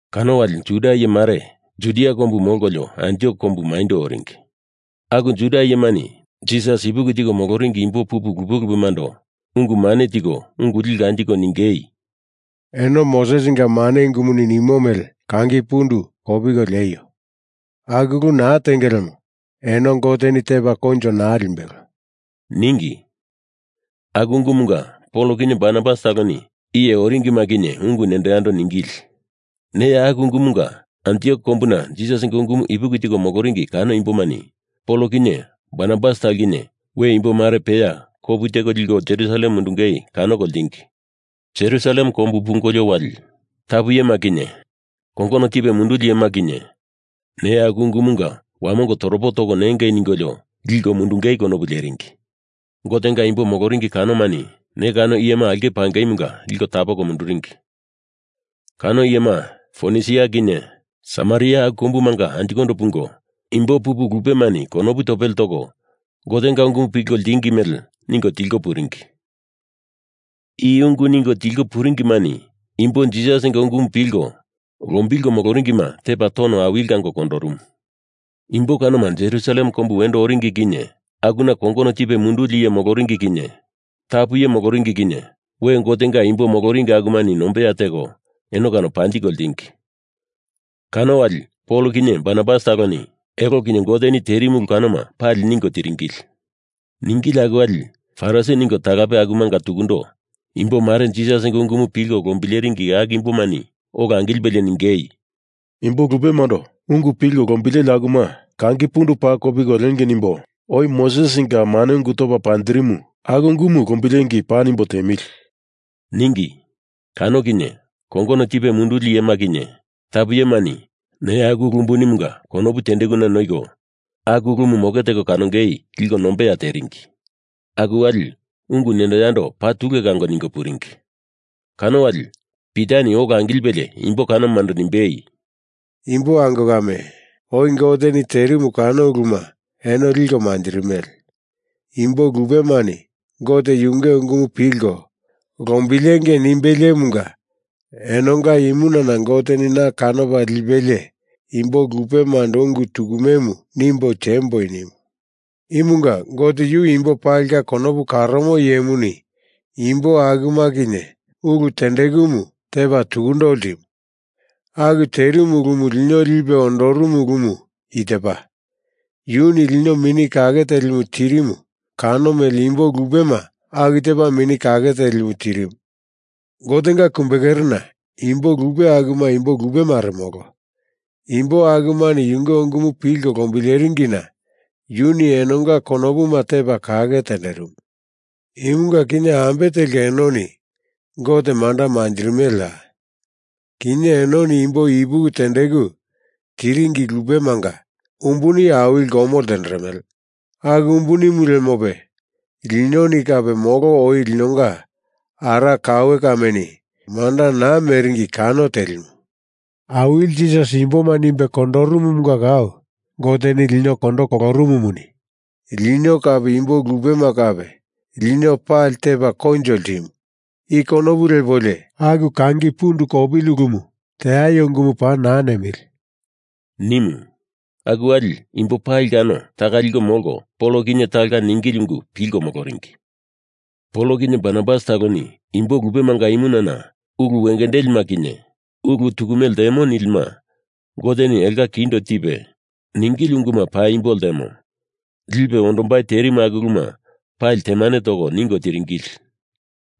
Kano wali Juda iye mare Judia kombu molkolio Antiok kombu maindo oringi. Aku Juda iyemani Jisas ipuki tiko moloringi imbo pupu lupemando ungu mane tiko ungu liko anjiko ningei, “Eno Mosesinga mane ungumuni nimo mele kangi pundu kopiko lieio. Aku ulu naa tenge lemo eno Goteni tepa koinjo naa limbelo,” ningi. Aku ungumunga Pol kinye Barnabas taloni iye oringima kinye ungu nendo yando ningili. Neya aku ungumunga Antiok kombuna Jisasinga ungumu ipuki tiko moloringi kano imbomani Pol kinye Barnabas talo kinye we imbo mare peya kopu teko liko Jerusalem mundungei kanoko ltingi. Jerusalem kombu pungolio wali tapu iyema kinye kongono tipe munduli iyema kinye neya aku ungumunga wamongo toropo toko nengei ningolio liko mundungei konopu leringi. Gotenga imbo moloringi kanomani ne kano iyema aulke pangeimunga liko tapoko munduringi. Kano iyema Fonisia kinye Samaria aku kombumanga anjikondo pungo imbo pupu lupemani konopu topele toko Gotenga ungumu pilko ltingi mele ningo tilko puringi. I ungu ningo tilko puringimani imbo Jisasinga ungumu pilko lombilko moloringima tepa tono awili kango kondorumu. Imbo kanoma Jerusalem kombu wendo oringi kinye akuna kongono tipe munduli iye moloringi kinye tapu iye moloringi kinye we Gotenga imbo moloringi akumani nombeya teko eno kano panjiko ltingi. Kano wali Pol kinye Barnabas taloni elo kinye Goteni terimu ulu kanoma pali ningo tiringili. Ningili aku wali Farisi ningo talape akumunga tukundo imbo mare Jisasinga ungumu pilko lombileringi aku imbomani ola angilipelie ningei, “Imbo lupemando ungu pilko lombileli akuma kangi pundu paa kopiko liengei nimbo oi Mosesinga mane ungu topa panjirimu aku ungumu lombilengei paa nimbo tiemili,” ningi. Kano kinye kongono tipe munduli iyema kinye tapu iyemani neya aku ulu unbunimunga konopu tendekuna noiko aku ulumu moke teko kanongei liko nombeya teringi. Aku wali ungu nendo yando paa tule kango ningo puringi. Kano wali Pitani ola angilipelie imbo kanomando nimbei, “Imbo ango kame, oi Goteni terimu kano uluma eno liko manjirimele. Imbo lupemani Gote yunge ungumu pilko lombilengei nimbeliemunga enonga imunana Goteni na kanopa lipelie imbo lupemando ungu tukumemu nimbo temboi nimu. Imunga Gote yu imbo palinga konopu karomo iyemuni imbo akuma kinye ulu tendekumu tepa tukundo ltimu. Aku terimu ulumu lino lipe ondorumu ulumu i tepa: Yuni lino Mini Kake Telimu tirimu kano mele imbo lupema aku tepa Mini Kake Telimu tirimu. Gotenga kumbekerena imbo lupe akuma imbo lupemare molo. Imbo akumani yunge ungumu pilko lombileringina yuni enonga konopuma tepa kake tenderimu. Imunga kinye ambe telka enoni Gote manda manjirimeleya? Kinye enoni imbo ipuki tendeku tiringi lupemanga umbuni awili lomo ltenderemele. Aku umbunimu lemope linoni kape molo oi linonga ara kaue kameni manda naa meringi kano telimu. Awili Jisas imboma nimbe kondorumunga kau Goteni lino kondo kolorumumuni lino kape imbo lupema kape lino pali tepa koinjo ltimumu, i konopu lepolio aku kangi pundu kopili ulumu teaio ungumu paa naa nemili,” nimu. Aku wali imbo pali kano taka liko molko Pol kinye talonga ningili ungu pilko moloringi. Pol kinye Barnabas taloni imbo lupemanga imunana ulu wengendelima kinye ulu tukume ltemo nilima Goteni elonga kindo tipe ningili unguma paimbo ltemo lipe ondombai terimu aku uluma pali temane toko ningo tiringili.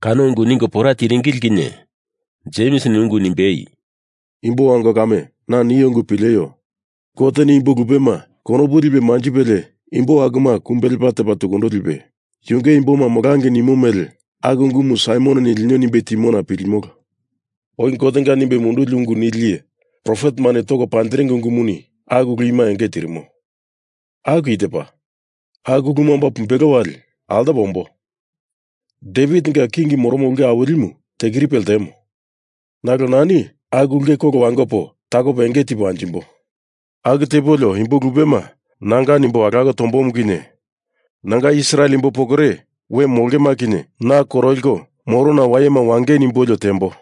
Kano ungu ningo pora tiringili kinye Jemsini ungu nimbei, “Imbo ango kame, na nio ungu pileio. Goteni imbo lupema konopu lipe manjipelie imbo akuma kumbe lepa tepa tukundo lipe yunge imboma molangei nimo mele aku ungumu Saimononi lino nimbe timona pilimolo. Oi Gotenga nimbe munduli ungu nili iye profetemani toko panjiringi ungumuni aku ulu ima enge tirimo. Aku i tepa, Aku uluma omba pumbelo wali altopo ombo. Devitinga king moromo ulke awilimu tekiripe ltemo. Nalo nani aku ulke kolo wangopo takopo enge tipo anjimbo. Aku tepolio imbo lupema nanga nimbo alako tombomu kinye nanga Israel imbo pokore we molongema kinye na koroliko morona wayema wangei nimbolio tembo,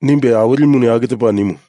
nimbe Awilimuni aku tepa nimu.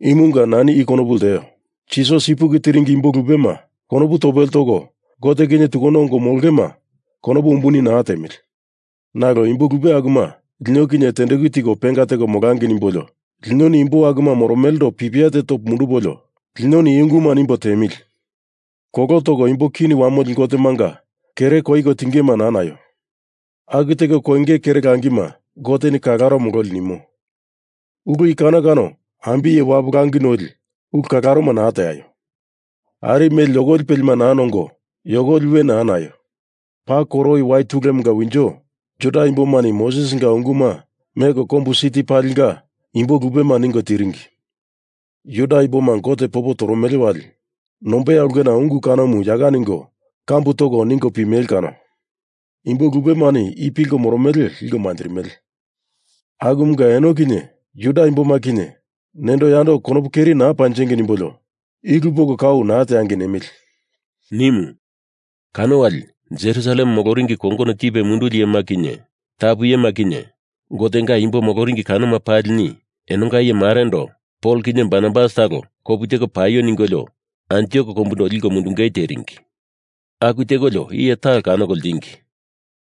Imunga nani i konopu lteo. Jisas ipuki tiringi imbo lupema konopu topele toko Gote kinye tukundo ongo molongema konopu umbuni lipo naa tiemili. Nalo imbo lupe akuma lino kinye tendeku tiko penga teko molangei nimbolio linoni imbo akuma moromelendo pipia te topo mundupolio linoni i unguma nimbo tiemili: Kolo toko imbo kini wamoli gotemanga kere koiko tingema naa naio. Aku teko koinge kere langima Goteni kalaro mololi nimo. Ulu i kano kano ambiye wapu langi noli ulu kalaroma naa teaio. Ari mele yokoli pelima naa nongo yokoli we naa naio. Paa koro oi wai tulemunga winjo Juda imbomani Mosesinga unguma meko kombu siti palinga imbo lupema ningo tiringi. Juda imboma Gote popo toromele wali nombeya ulkena ungu kanomu yaka ningo kambu toko ningo pimele kano. Imbo lupemani i pilko moromele liko manjirimele. Akumunga eno kinye Juda imboma kinye nendo yando konopu keri naa panjengei nimbolio i ulu poko kau naa teangei nemili,” nimu. Kano wali Jerusalem moloringi kongono tipe munduli iyema kinye tapu iyema kinye Gotenga imbo moloringi kanoma palini enonga iye marendo Pol kinye Barnabas talo kopu teko paio ningolio Antiok kombundo liko mundungei teringi. Aku tekolio iye talo kanoko ltingi.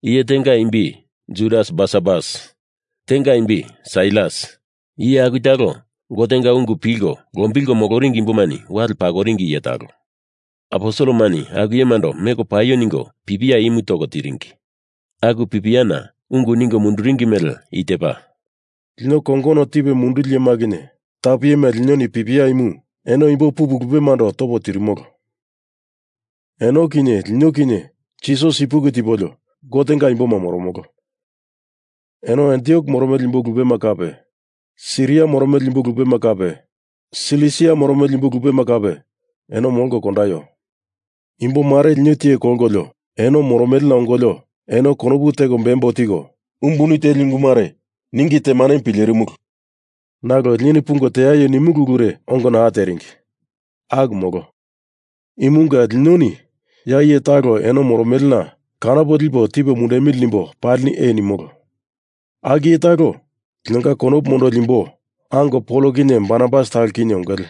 Iye tenga imbi Judas Barsabas. Tenga imbi Sailas. Iye aku talo Gotenga ungu pilko lombilko moloringi imbomani wale pakoringi iye talo. Aposelemani aku iyemando meko paio ningo pipia imu toko tiringi. Aku pipiana ungu ningo munduringi mele i tepa, “Lino kongono tipe munduli iyema kinye tapu iyema linoni pipia imu eno imbo pupu lupemando topo tirimolo. Eno kinye lino kinye Jisas ipuki tipolio Gotenga imboma moromolo. Eno Antiok moromele imbo lupema kape Siria moromele imbo lupema kape Silisia moromele imbo lupema kape, eno molko kondaio. Imbo mare lino tiye kolkolio eno moromelena ongolio eno konopu teko bembo tiko umbuni teli ungu mare ningi temanemu pilerimulu. Nalo linoni pungo teaio nimulu ulure ongo naa teringi. Aku molo. Imunga linoni ya iye talo eno moromelena kanopo lipo tipo mundemili nimbo palini ee nimolo. Aku iye talo linonga konopu mondoli imbo ango Pol kinye Barnabas talo kinye ongele.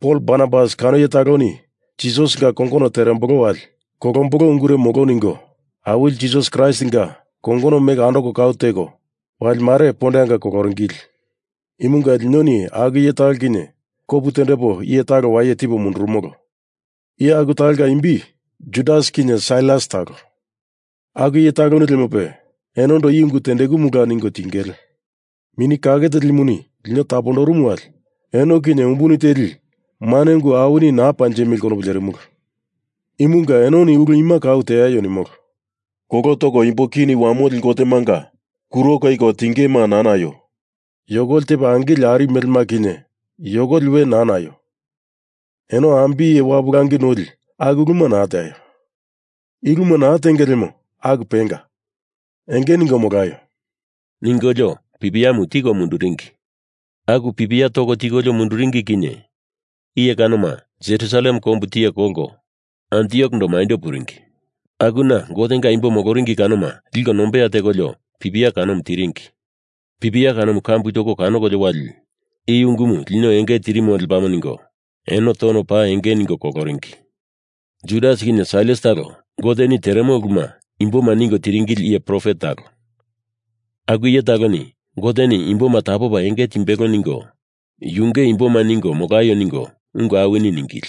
Pol Barnabas kano iye taloni Jisasinga kongono terembolo wali kolombolo ungure molo ningo Awili Jisas Kraistinga kongono meko andoko kau teko, wali mare pondeanga koloringili. Imunga linoni aku iye talo kinye kopu tendepo iye talo waye tipo mundurumolo. Iye aku talonga imbi Judas kinye Sailas talo. Aku iye taloni lemope enondo i ungu tendekumula ningo tingele. Mini Kake Telimuni lino tapondorumu wali eno kinye umbuni teli mane ungu awini naa panjemili konopu lerimulu. Imunga enoni ulu ima kau teaio nimolo. Kolo toko imbo kini wamoli gotemanga kuro koiko tingema naa naio. Yokoli tepa angili ari melema kinye yokoli we naa naio. Eno ambiye wapu langi noli aku uluma naa teaio. I uluma naa tenge lemo aku penga. Enge ningo molaio,” ningolio pipiamu tiko munduringi. Aku pipia toko tikolio munduringi kinye iye kanoma Jerusalem kombu tiye kolko Anjikondo maindo puringi. Akuna Gotenga imbo moloringi kanoma liko nombeya tekolio pipia kanomu tiringi. Pipia kanomu kambu toko kanokolio wali i ungumu lino enge tirimo lepamo ningo eno tono paa enge ningo koloringi. Judas kinye Sailas talo Goteni teremo uluma imboma ningo tiringili iye profet talo. Aku iye taloni Goteni imboma tapopa enge timbelo ningo yunge imboma ningo molaio ningo ungu awini ningili.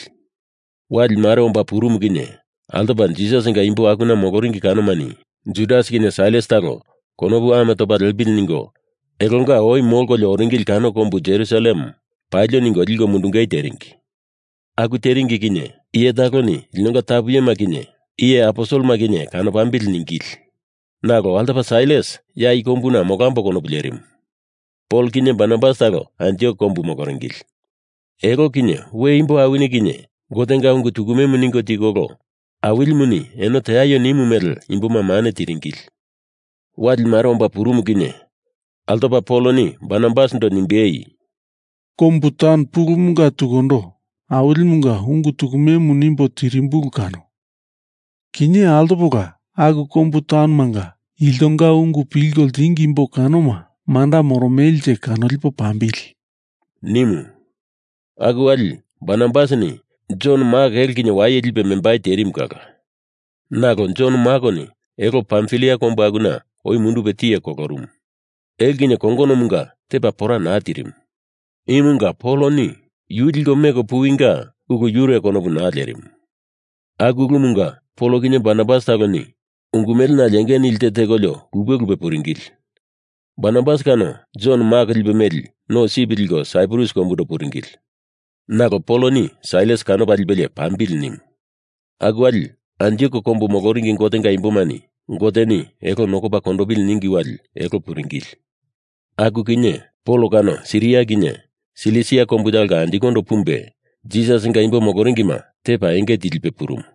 Wali mare omba purumu kinye altopa Jisasinga imbo akuna moloringi kanomani Judas kinye Sailas talo konopu ame topa lepili ningo elonga oi molkolio oringili kano kombu Jerusalem palio ningo liko mundungei teringi. Aku teringi kinye iye taloni linonga tapu iyema kinye iye aposelema kinye kanopambili ningili nalo altopa Sailas ya i kombuna molambo konopu lerimu. Pol kinye Barnabas talo Antiok kombu moloringili. Elo kinye we imbo awini kinye Gotenga ungu tukumemu ningo tikolo Awilimuni eno teaio nimu mele imboma mane tiringili. Wali mare omba purumu kinye altopa Poloni Barnabasindo nimbei, “Kombu taun pulumunga tukundo Awilimunga ungu tukumemu nimbo tirimbulu kano. Kinye altopola aku kombu taunomanga iltonga ungu pilko ltingi imbo kanoma manda moromelenje kanolipo pambili,” nimu. Aku wali Barnabasini Jon Mak elo kinye waye lipe membai terimu kala. Nalo Jon Makoni elo Pamfilia kombu akuna oi mundupe tiye kolorumu. Elo kinye kongonomunga tepa pora naa tirimu. Imunga Poloni yu liko meko puwinga ulu yure konopu naa lerimu. Aku ulumunga Pol kinye Barnabas taloni ungu mele nale enge nili te tekolio lupe lupe puringili. Barnabas kano Jon Mak lipe meli no sip liko Saiprus kombundo puringili. Nalo Poloni Sailas kanopa lipelie pambili nimu. Aku wali Antiok kombu moloringi Gotenga imbomani Goteni elo nokopa kondopili ningi wali elo puringili. Aku kinye Pol kano Siria kinye Silisia kombu talonga anjikondo pumbe Jisasinga imbo moloringima tepa enge tilipe purumu.